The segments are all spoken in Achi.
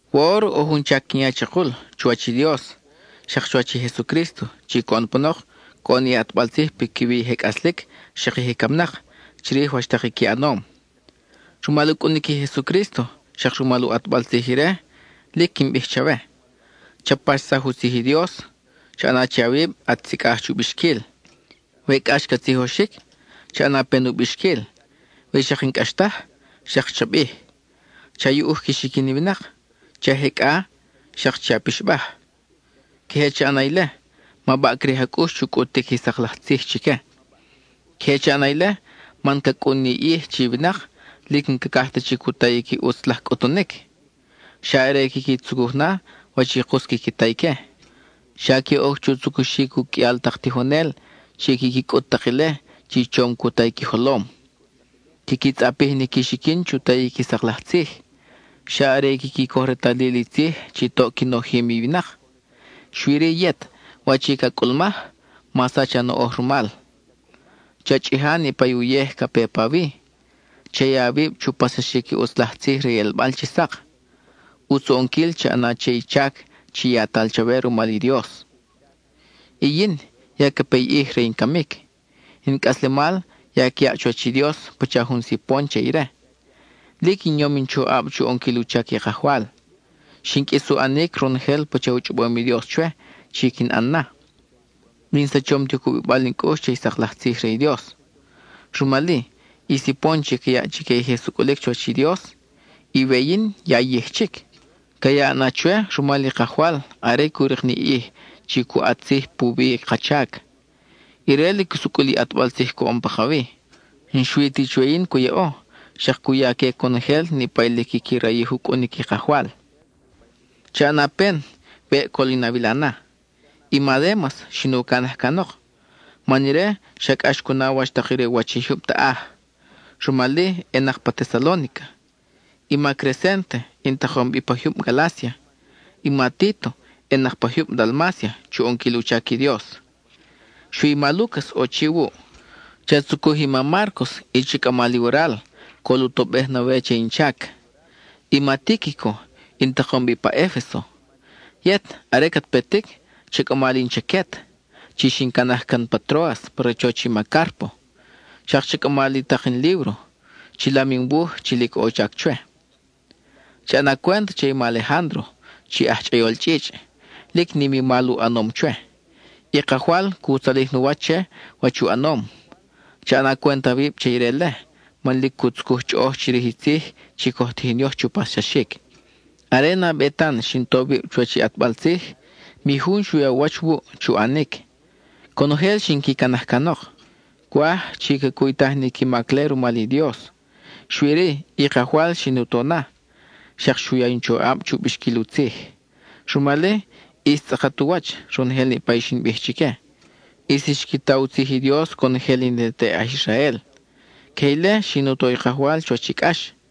Woʼor ʼo jun chac quin ya chakul chuwach i Dios xak chuwach i Jesucrísto chi coʼon panok coʼon ni ʼatbal tzij piquiwi i je cʼaslic xak i je camnak, chirij wach tak i qui ʼanom. Rumal u cʼunic i Jesucrísto, xak rumal u ʼatbal tzij ire, lic quin bij chawe: cha paxsaj u tzij i Dios; cha ʼana che awib at sicʼaj chu bixquil; we cʼax ca tzijoxic, cha ʼana pen u bixquil; we xak n-cʼax taj, xak cha bij. Cha yuʼuj qui xiquin i winak; che a jecʼa, xak che a pixbaj. Queje cha ʼana ile, ma baʼcrij a cʼux chu cʼutic i sak laj tzij chique. Queje cha ʼana ile, man ca cʼun ni ʼij chi i winak lic n-cacaj ta chic u tayic i ʼutz laj cʼutunic; xa are quiqui tzucuj na wach i kus quiqui ta ique. Xa que oc chu tzucuxic u qʼuial tak tijonel chi quiqui cʼut tak ile chi chom cu ta i qui jolom. Quiqui tzʼapij ni qui xiquin chu tayic i sak laj tzij; xa are i quiqui coj retalil i tzij chi toʼ qui nojim i winak. Xui-ri yet, wach i ca cʼulmaj, ma sach a noʼoj rumal; cha chʼija niʼpa uyej ca pe pawi; cha ya awib chu paxsaxic i ʼutz laj tzij re i ʼelbal chi sak; ʼutz u ʼonquil cha ʼana che i chac yatal chawe rumal i Dios. Y yin, ya ca pe i ʼij re in camic, in cʼaslemal ya ca yaʼ chuwach i Dios pacha jun sipon che ire. Lic in yom in choʼab chu ʼonquil u chac i Kajwal; xin qʼuis u ʼanic ronojel pacha u chʼobom i Dios chwe chi quin ʼan na; y n-in sachom ti u cubibal in cʼux che i sak laj tzij re i Dios. Rumal-i, i sipon chi ca yaʼ chique i je sucʼulic chuwach i Dios, i we yin ya yij chic; ca yaʼ na chwe rumal i Kajwal are cu rik ni i ʼij chi cu ʼat tzij puwi i ka chac. Ire lic sucʼul i ʼatbal tzij coʼon pakawi. N-xui ti chwe yin cu yaʼo, xak cu ya que conojel niʼpa i lic quiqui rayij u cʼunic i Kajwal. Cha ʼana pen weʼ col in awila na. I ma Démas xin u canaj canok, man ire xa cʼax cu na wach tak re u wach i jyub taʼaj; rumal-i ʼenak pa Tesalónica. I ma Crecénte in takom bi pa jyub Galácia, i ma Títo ʼenak pa jyub Dalmácia (chu ʼonquil u chac i Dios). Xui i ma Lúcas ʼo chi wuʼ. Cha tzucuj i ma Márcos, y cha cʼama li waral, col u tobej na we che in chac. I ma Tíquico, in takom bi pa Efeso. Yet, are cat petic cha cʼama li in chaquet, chi xin canaj can pa Tróas pa rachoch i ma Cárpo; xak cha cʼama li tak in líbro, chilam in wuj chi lic ʼo u chac chwe. Cha ʼana cwent che i ma Alejándro chi aj chʼayol chʼichʼ. Lic nim i mal u ʼanom chwe; i Kajwal cu tzalij nu wach che wach i u ʼanom. Cha ʼana cwent awib che ire-le, man lic cu tzucuj chʼoʼoj chirij i tzij chi coj tijin yoj chu paxsaxic. Are nabe tan xin to wib chuwach i ʼatbal tzij, mi jun xu ya u wach wuʼ chu ʼanic; conojel xin qui canaj canok. Cwaj chi ca cuytaj ni qui mac-le rumal i Dios. Xui-ri, i Kajwal xin u to na, xak xu ya in choʼab chu bixquil u tzij. Rumal-i, ʼis tzʼakat u wach ronojel niʼpa i xin bij chique; ʼis xqui ta u tzij i Dios conojel i ne te aj Israel. Queje ile xin u to i Kajwal chuwach i cʼax,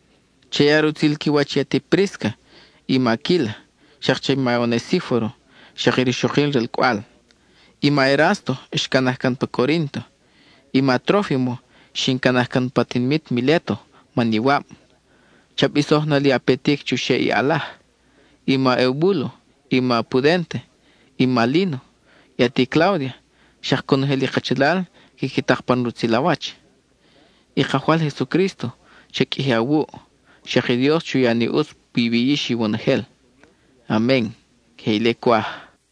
Cha ya rutzil qui wach i ati Prísca i ma Aquíla, xak che i ma Onesíforo y rixokil ralcʼwal. I ma Erásto xcanaj can pa Corínto. I ma Trófimo, xin canaj can pa tinimit Miléto man iwab. Cha bisoj na li a petic chuxeʼ i ʼalaj. I ma Eubúlo, i ma Pudénte, i ma Líno, i ati Cláudia xak conojel i kachalal quiqui tak pan rutzil a wach. I Kajwal Jesucrísto cha qʼuiji awuʼ, xak i Dios chu ya ni ʼutz piwi yix iwonojel. Amen (queje ile cwaj).